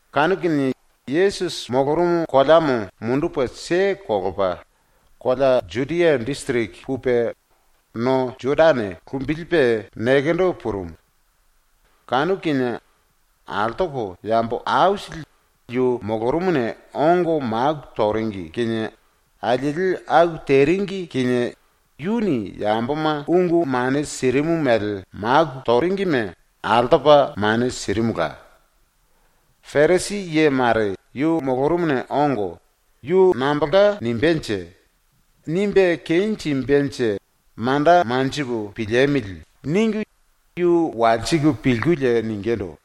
Kanu kinie Yesusi molorumu koleamo mundupe kelepa kolea Judia disiriki pupe no Jodane lumbilipe nekendo purumu. Kanu kinie altoko yambo aisili yu molorumuna ongo maku toringi kinie alieli aku teringi kinie yuni yamboma ungu mane sirimu mele maku toringime altopa mane sirimula. Parisi ye mare yu molorumuna ongo ‘Yu nambolka nimbénje? Nimbe kenjimbenje manda manjipu piliemili.’ ningu yu walsiku pilkulie ningindu: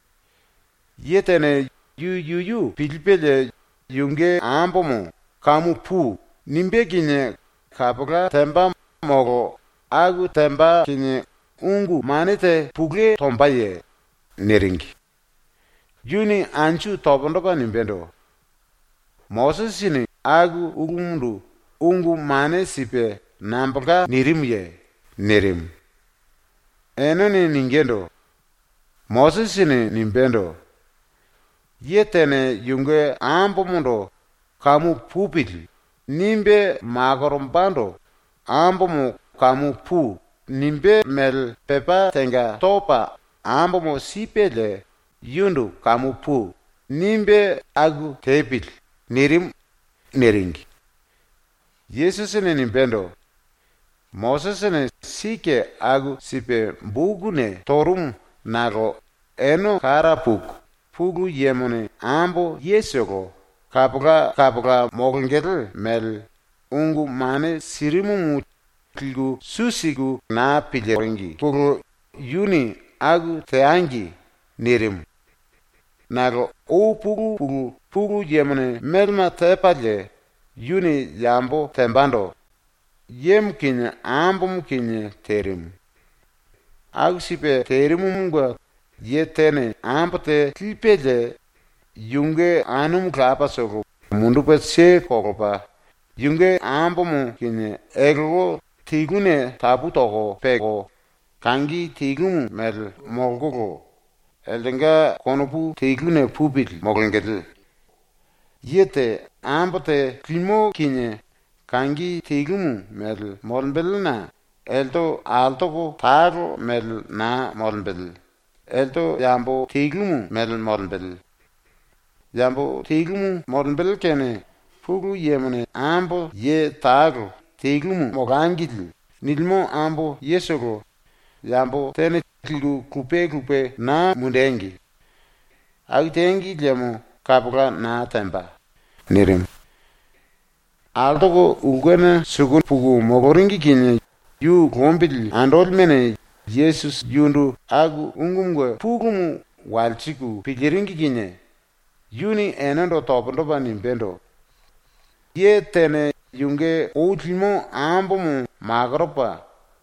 “Ye tene yu yuyu pilipelie yunge ambomo “Kamu pui.” nimbé kinie kapola temba molo aku temba kinie ungu mane te pulue tombaye?” niringi. Yuni anju pundu topa nimbendo: “Mosisini aku ulumundu ungu mane sipe nambolka nirimuye?” nirimu. Enene ningindu: “Mosisini nimbendo: “Ye tene yunge ambomondo ‘Kamu pupili.’ nimbe makorombando ambomo “Kamu pui.” nimbé mele pepá tenga topa ambomo sipelie yundu “Kamu pui.” nimbe aku tepili.” nirimu.” niringi. Yesusini nimbendo: “Mosisini sike aku sipe bokuna torumu nakolo ene kara puku Pulu Yemone ambo yetolo kapola kapola molongele mele ungu mane sirimumu liku su siringi naa piliringine yuni “Aku teangi.” nirimu. Nakolo ou pulu pulu Pulu Yemone melema tepalie yuni yambo tembando yemo kinie ambomo kinie terimu. ‘Aku sipe terimumunge ye tene ambo te lipelie yunge anumu lapatolo mundupe kelepa yunge ambomo kinie eltelte teluna tapu toko peko, kangi telumu mele ⸤molkolo eltenga konopu teluna pupili⸥ molongele.’ Ye te ambo te limo kinie kangi telumu mele molembelena elte altoko talo mele naa molembele, elte yambo telumu mele molembele. Yambo telumu molembele kene Pulu Yemone ambo ye talo ‘Telumu molangili.’ nilimo ambo yetolo yambo tene liku lupe lupe naa mundengi. Aku tengi liemo kapola naa temba.” nirimu. Altoko ulkena suku puku moloringi kinie yu lombili andolimene Yesusi yundu aku ungumunge pulumu walsiku piliringi kinie yuni enendo pundu topa nimbendo: “Ye tene yunge ou limo ambomo makoropa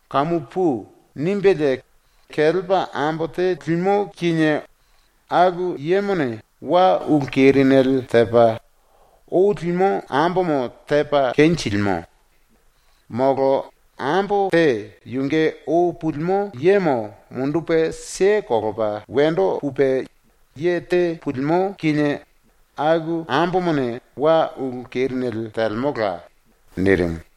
“kamu pui.” nimbelie kelepa ambo te limo kinie aku yemone wa ulu kerinele tepa, ou limo ambomo tepa kenjilimo. Molo ambo te yunge ou pulimo yemo mundupe kelepa wendo pupe ye te pulimo kinie aku ambomone wa ulu kerinele telemola.” nirimu.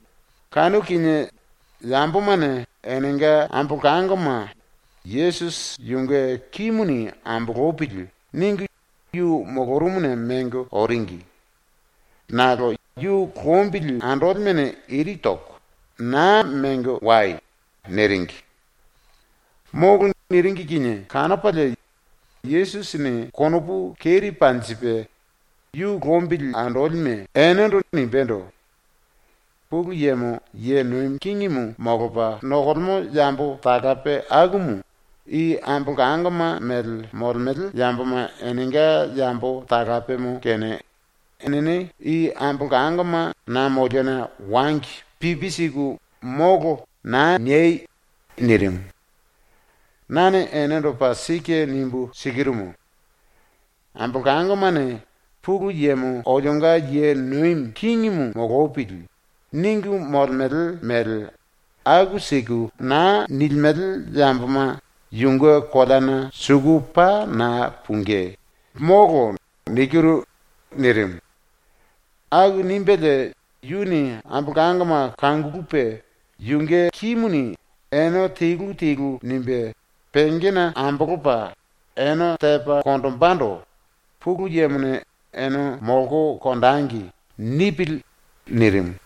Kanu kinie yambomane enenga ambolangoma ‘Yesusi yunge kimuni ambolopili.’ ningu yu molorumuna mengo oringi. Nakolo yu lombili andolimene iri toko ⸤“Naa mengo wai!”⸥ niringi. ⸤“Molo.” niringi kinie⸥ kanopalie Yesusini konopu keri panjipe ⸤yu lombili andolime⸥ enendo nimbendo: “Pulu Yemo ye nomi kingimu molopa nokolemo yambo talape akumu i ambolangoma mele molemele yamboma enenga yambo talapemo kene enene i ambolangoma na moliona wangi pipi siku “Molo.” naa niei!” ⸤nirimu.⸥ “Nane enendo paa sike nimbu sikirumu: Ambolangomane ‘Pulu Yemo olionga ye nomi kingimu molopili.’ ningu molemele mele aku siku naa nilimele yamboma yunge koleana suku paa naa pungí, molo.” nirimu. Aku nimbelie yuni ambolangoma kangulupe yunge kimuni ene telu telu nimbe pengena ambolopa ene tepa konjimbendo “Pulu Yemone “Ene molko konjengi.” nipili.” nirimu.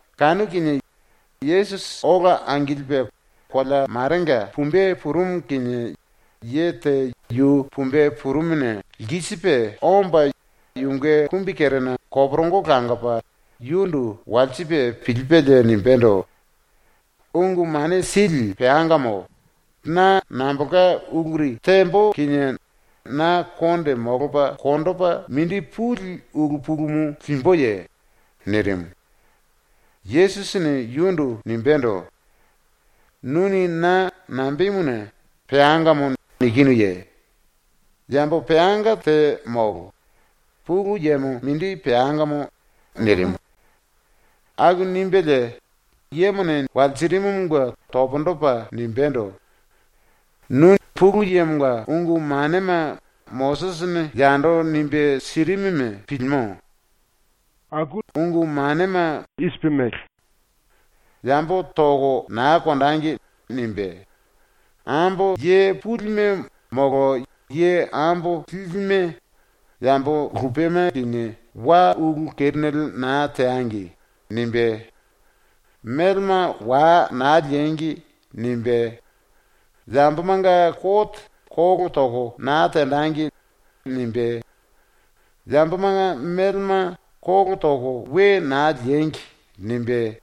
Kanu kinie Yesusi ola angilipe kolea marenga pumbe purumu kinie ye te yu pumbe purumuna lkisipe omba yunge kumbikerena koporongo langopa yundu walsipe pilipelie nimbendo: “Ungu Mane Sili peangamo, na nambolka uluri tembo kinie na konde molopa konjipe mindi puli ulu pulumu limbuye?” nirimu. Yesusini yundu nimbendo: “Nuni na nambemuna “Peangamo” nikinuye? Yambo peanga te molo. Pulu Yemo mindi peangamo.” nirimu. ⸤Aku nimbelie yemone walsirimumunge pundu topa nimbendo:⸥ “Nu ⸤Pulu Yemonga⸥ ungu manema ⸤Mosisini yando nimbe sirimuma⸥ pilino. Yuni nimbendo: “Yambo toko naa konjengi.” nimbe, “Ambo ye pulime molo ye ambo lilime yambo lupema kinie wa ulu kerinele naa teangi.” nimbe, “Melema wa naa liengi.” nimbe, “Yambomanga kote kolo toko naa tenjengi.” nimbe, “Yambomanga melema kolo toko we naa liengi.” nimbe,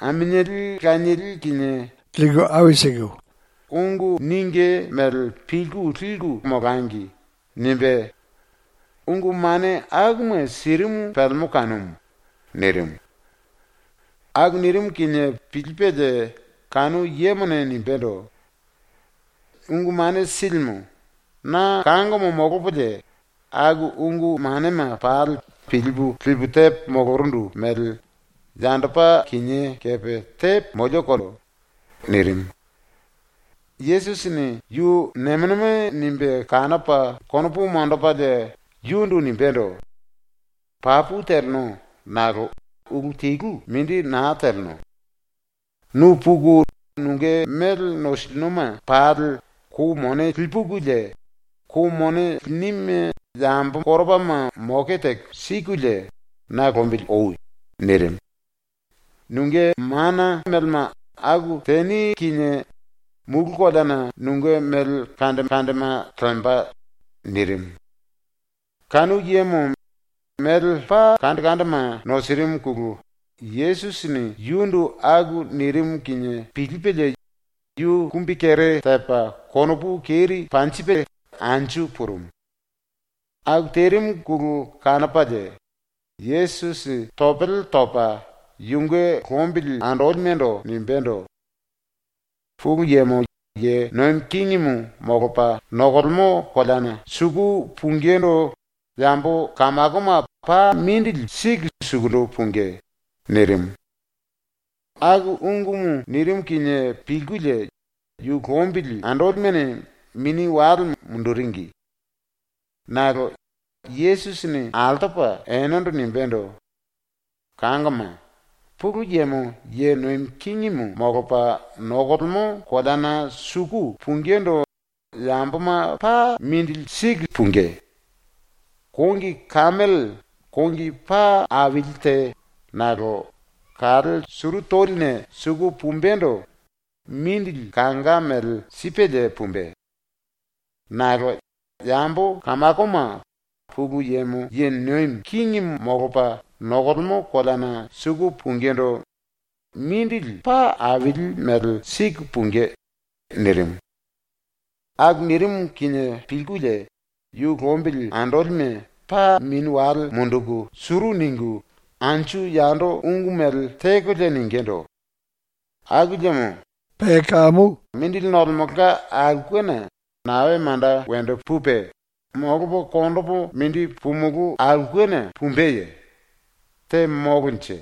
“Aminieli lanieli kinie teko konjiku, ungu ningí mele pilku liku teko molangi.” nimbe, ungu mane akuma sirimu pelemo kanumu.” nirimu. Aku nirimu kinie pilipelie kanu yemone nimbendo: “Ungu Mane Silimu, na kangomo molopolie aku ungu manema pali pilipu lipu tepo molorundu mele yandopa kinié kepe tepo molioko.” nirimu. Yesusini yu nemo nemo nimbe kanopa konopu monjipelie yundu nimbendo: “Papu teleno nakolo ulu telu mindi naa teleno. Nu puku nunge mele nosilinoma pali kou mone lipukulie, kou mone linime yambo koropama moke teko sikulie na lombili oi.” nirimu. “Nunge ⸤mana⸥ melema aku teni kinie mulu koleana nunge mele aisili lemba.” nirimu. Kanu yemo mele paa aisili nosirimuna Yesusini yundu aku nirimu kinie pilipelie yu kumbikere tepa konopu keri panjilipe anju purumu. ⸤Aku terimuna kanopalie⸥ Yesusi topele topa yunge lombili andolimendo nimbendo: “Pulu Yemo ye nomi kingimu molopa nokolemo koleana suku pungindu yambo kamakoma paa mindili siku suku pungí.” nirimu. Aku ungumu nirimu ⸤kinie pilkulie⸥ yu lombili andolimene mini wale munduringi. Nakolo Yesusini altopa enendo nimbendo: “Kangoma, Pulu Yemo ye nomi kingimu molopa nokolemo koleana suku pungindu yamboma paa mindili siku pungí. Kongi kemele ⸤kongi paa aili te nakolo⸥ kale suru toline suku pumbendo mindili kanga mele sipelie pumbe. Nakolo yambo kamakoma Pulu Yemo ye nomi kingimu molopa nokolemo koleana suku pungindu mindili paa aili mele siku pungí.” nirimu. ⸤Aku nirimu kinie pilkulie⸥ yu lombili andolime paa mini wale munduku suru ningu anju yando ungu mele tekolie ningindu: “Aku liemo mindili nolemelka aulkena nae manda wendo pupe, molopo konjimulu aulkena pumbeye? Te molonje?”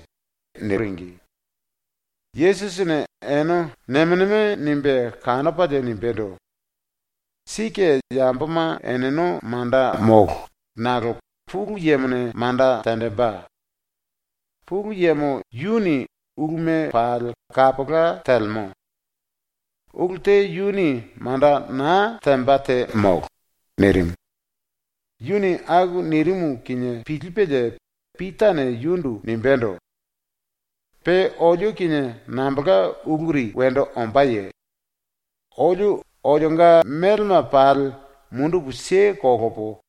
niringi. Yesusini ene nemo nemo nimbe kanopalie nimbendo: “Sike yamboma eneno manda molo, nakolo Pulu Yemone manda tenjimbe. Pulu Yemo yuni uluma pali kapola telemo. Ulu te yuni manda naa temba te molo.” nirimu. Yuni aku nirimu kinie pilipelie Pitane yundu nimbendo: “⸤Pe olio kinie nambolka uluri wendo ombáye?⸥ Olio olionga melema pali mundupu kelepo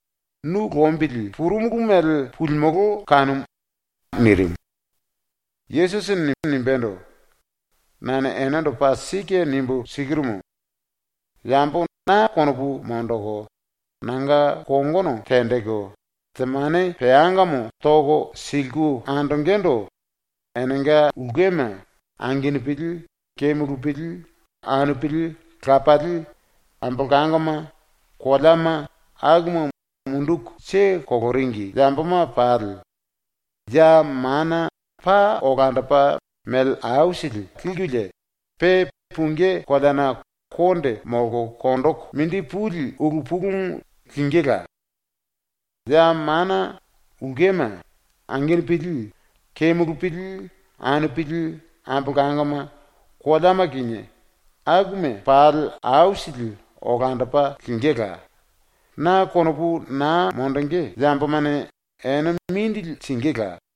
nu lombili purumulu mele pulimolo kanumu.” nirimu. Yesusini nimbendo: “Nane enendo paa sike nimbu sikirumu: Yambo na konopu monjiku nanga kongono tenjiku temane peangamo toko siliku andongendo enenga ulkema, angenupili, kemulupili, anupili, lapali, ambolangoma, koleama, akuma munduku keleringi yamboma pali ya mana paa olandopa mele aisili likulie, pe pungí koleana konde molko konjiku mindi puli ulu pulumu lingíla. Ya mana ulkema, angenupili, kemulupili, anupili, ambolangoma, koleama kinie, akuma pali aisili olandopa lingíla; ⸤na konopu naa monjingí yambomane⸥ ene mindili singíla.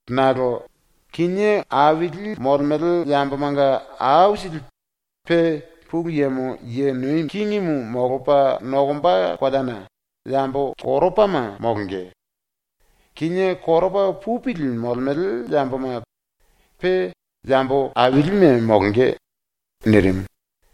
Nakolo kinié aili molemele yambomanga aisili pe ⸤Pulu Yemo ye nomi kingimu molopa nokomba koleana⸥ yambo koropama molonge; kinié koropa pupili molemele yamboma pe yambo ailime molonge.” nirimu.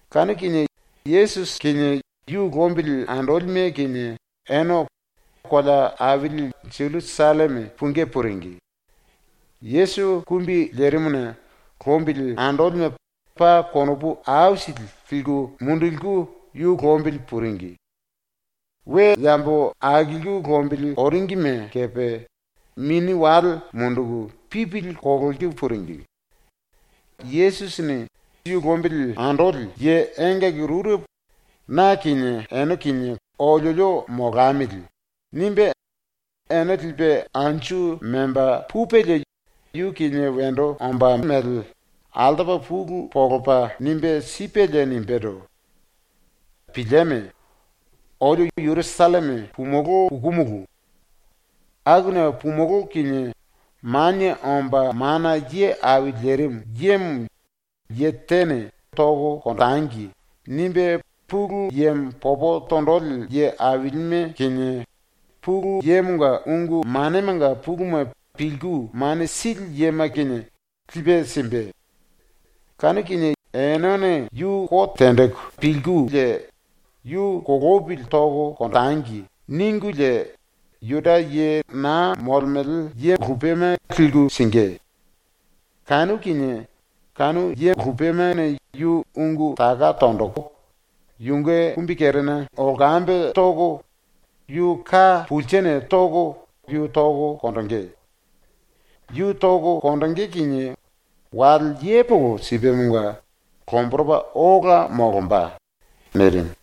Kanu kinie ⸤Yesusi kinie yu lombili andolime kinie⸥ ene kolea aili Jerusalleme pungí puringi. Yesusi kumbi lerimuna lombili andolime paa konopu aisili liku munduliku yu lombili puringi. We yambo akilku lombili oringime kepe mini wale munduku pipili kololiku puringi. Yesusini ⸤yu lombili andoli⸥ ye engaki rurepo ‘na kinie ene kinie oliolio molamili.’ nimbe ene lipe anju memba pupelie yu kinie wendo ombá mele altopa pulu monjipe nimbe sipelie nimbendo: “Pilieme. Olio Jerusalleme pumulú pukumulu. Akuna pumulú kinie Manie Omba Mana Ye Au Lerimu Yemo ye tene ‘Tangi.’ nimbe Pulu Yemo popo tonjili ye ailime kinie, Pulu Yemonga ungu manemanga puluma pilku mane sili yema kinie, lipe simbe, enene yu kote tenjiku ‘Yu kolopili tangi.’ ningulie Juda ye naa molemele yema liku singí. Kanu kinie kanu yemane yu ungu taka tonjiku yunge kumbikerena lkambe toko yu ka pulsene toko yu toko konjingí. Yu toko konjingí kinie wale yepoko sipemonga lomboropa ola molomba.” nirimu.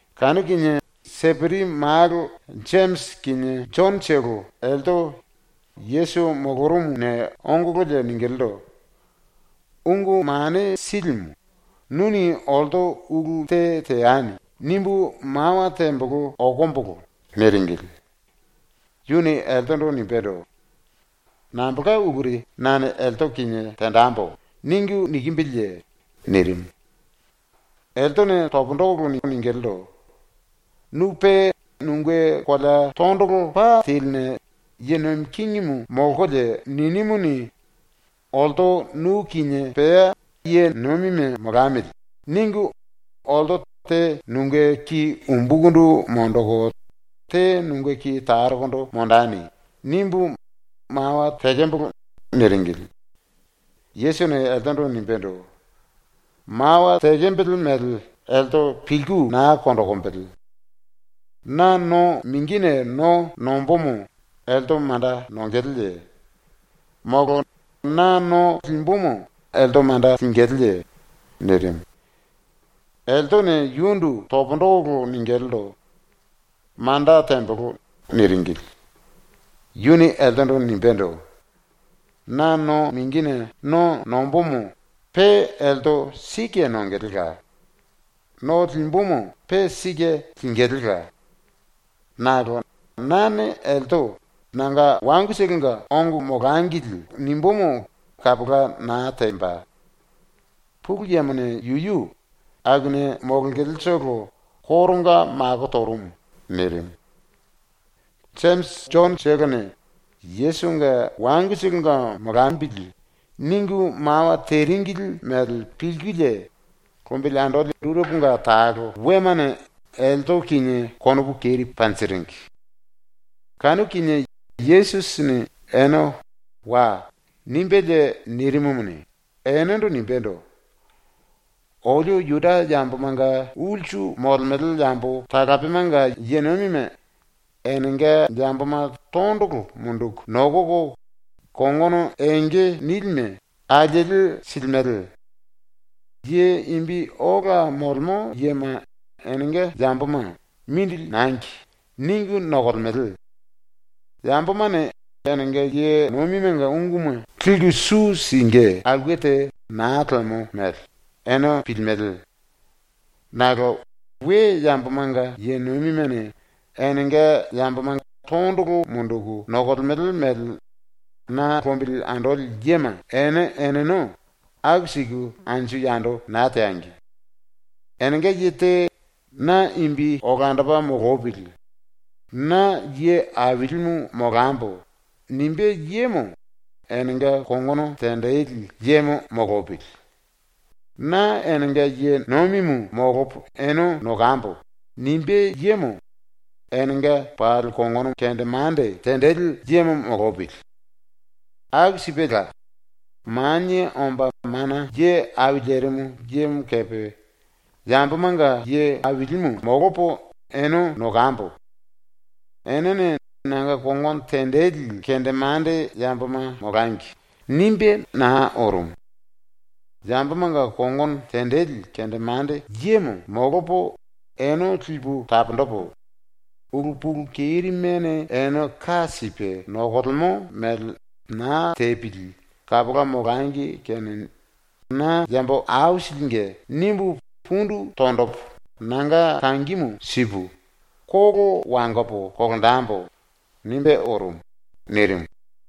Kanu kinie Seperi malo Jemisi kinie Jonotolo elte Yesusi molorumuna ongololie ningilindu: “Ungu Mane Silimu, nuni ‘Olto ulu te teani.’ nimbu mawa tembolo okombolo.” niringili. Yuni eltendo nimbendo: “Nambolka uluri ‘nane elte kinie tenjembo.’ ningu nikimbiliye?” nirimu. Eltene pundu toko ningilindu: “Nu pe nunge kolea tondolo pa teline ⸤ye nomi kingimu molkolie ninimuni, ‘olto nu kinie pea ye nomime molamili.’ ningu⸥ ‘olto te nunge ki umbukundu monjiku te nunge ki tarokondo monjeni.’ nimbu mawa tekembolo.” niringili. Yesusini eltendo nimbendo: “Mawa tekembele mele elte pilku naa konjikimbili. Na no mingine no nombomo elte manda nongeleye? Molo na no limbumu elte manda lingilíye?” nirimu. Eltene yundu pundu toko ningilindu: “Manda tembolo.” niringili. Yuni eltendo nimbendo: “Na no mingine no nombomo pe elte sike nongelela. No limbumu pe sike lingilíla. Nakolo nane elte “Nanga wangutolonga ongo molangili.” nimbumu kapola naa temba. ⸤Pulu Yemone yuyu⸥ akuna molongeletolo koronga mako torumu.” nirimu. Jemisi Jonotolone ⸤‘Yesusinge wangutolonga molambili.’⸥ ningu mawa teringili mele pilkulie lombili andoli rureponga talo wemane elte kinie konopu keri panjiringi. Kanu kinie Yesusini ene “Wai.” nimbelie nirimumuni, enendo nimbendo: “Olio Juda yambomanga ulsu molemele yambo talapemanga ye nomime enenga yamboma tondolo munduku nokoko kongono enge nilime alieli silimele. Ye imbi ola molemo yema enenga yamboma ‘Mindili nangi.’ ningu nokolemele. ⸤Yambomane enenga ye nomimenga unguma liku su singí aulke te naa lemo mele⸥ ene pilimele. Nakolo ⸤we yambomanga ye nomimene enenga yamboma tondolo munduku nokolemele mele na lombili andoli yema⸥ ene eneno aku siku anju yando naa teangi. Enenga ye te ‘Na imbi olandopa molopili. Na ye ailimu molambo.’ nimbé yemo enenga kongono tenjili yemo molopili. ‘Na enenga ye nomimu molopo ene nokambo.’ nimbé yemo enenga pali kongono kendemande tenjili yemo molopili. Aku sipela, Manie Omba Mana Ye Au Lerimu Yemo kepe ‘Yambomanga ye ailimu molopo ene nokambo. Enene nanga kongono tenjili kendemande yamboma molangi.’ nimbe naa orumu. ‘Yambomanga kongono tenjili kendemande yemo molopo ene lipu taponjipu, ulu pulu kerimene ene ka sipe nokolemo mele naa tepili kapola molangi kene na yambo aisilinge nimbu pundu tonjipu nanga kangimu sipu, kolo wangopo kolonjembo.’ nimbe orumu.” nirimu.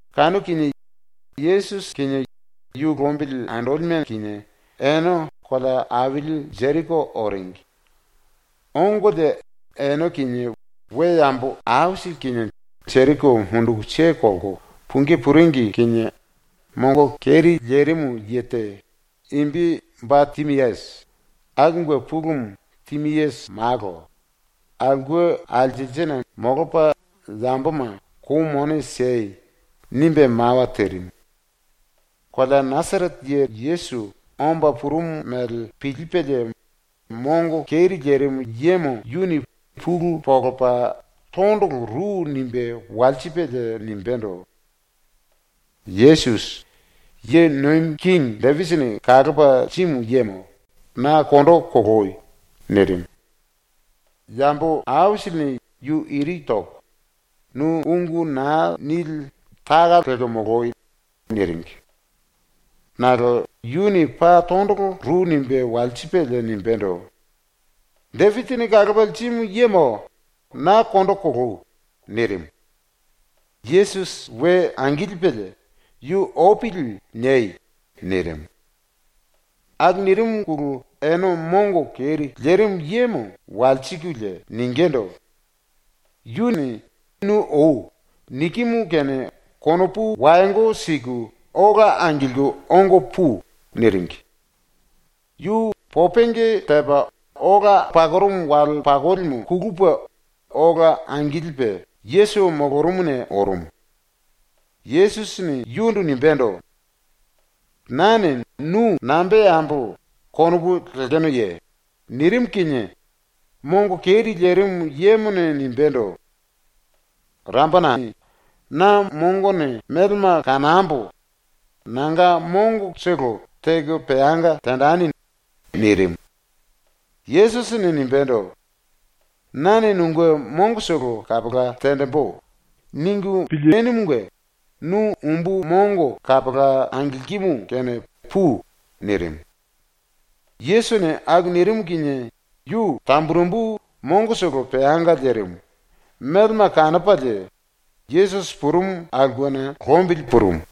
Kanu kinie Yesusi kinie yu lombili andolime kinie ene kolea aili Jeriko oringi. Ongolie ene kinie we yambo aisili kinie Jeriko munduku kelko pungí puringi kinie mongo keri lerimu ye te, imbi Ba Timiasi, (akumunge pulumu Timiasi malo,) aulke alselsena molopa yamboma “Kou mone siei.” nimbe mawa terimu. Kolea Nasarete ye Yesusi omba purumu mele pilipelie mongo keri lerimu yemo yuni pulu monjipe tondolo ru nimbe walsipelie nimbendo: “Yesusi, ⸤ye nomi kingi⸥ Depisini kalopa lirimu yemo, na kondo koloi!” nirimu. Yambo aisilini yu iri toko “Nu ungu naa nili taka lelko moloi!” niringi. Nakolo yuni paa tondolo ru nimbe walsipelie nimbendo: “Depisini kalopa lirimu yemo, na kondo koloi!” nirimu. Yesusi we angilipelie “Yu opili niei.” nirimu. Aku nirimuna ene mongo keri lerimu yemo walsikulie ningindu: “Yuni “Nu oi.” nikimu kene konopu wayongo siku ola angilku ongo pui.” niringi. Yu popenge tepa ola pakorumu wale pakolimu kulupe ola angilipe Yesusi molorumuna orumu. Yesusini yundu nimbendo: “Nane nu nambe teambo konopu lekenoye?” nirimu kinie mongo keri lerimu yemone nimbendo: “Raponai, na mongone melema kanambo nanga mongotolo teko peanga tenjeni.” nirimu. Yesusini nimbendo: “‘Nane nunge mongotolo kapola tenjimbu.’ konopu lenumunge nu umbu mongo kapola angilkimu kene pui.” nirimu. Yesusini aku nirimu kinie yu tamburembu mongotolo peanga lerimu, melema kanopalie, Yesusi purumu aulkena lombili purumu.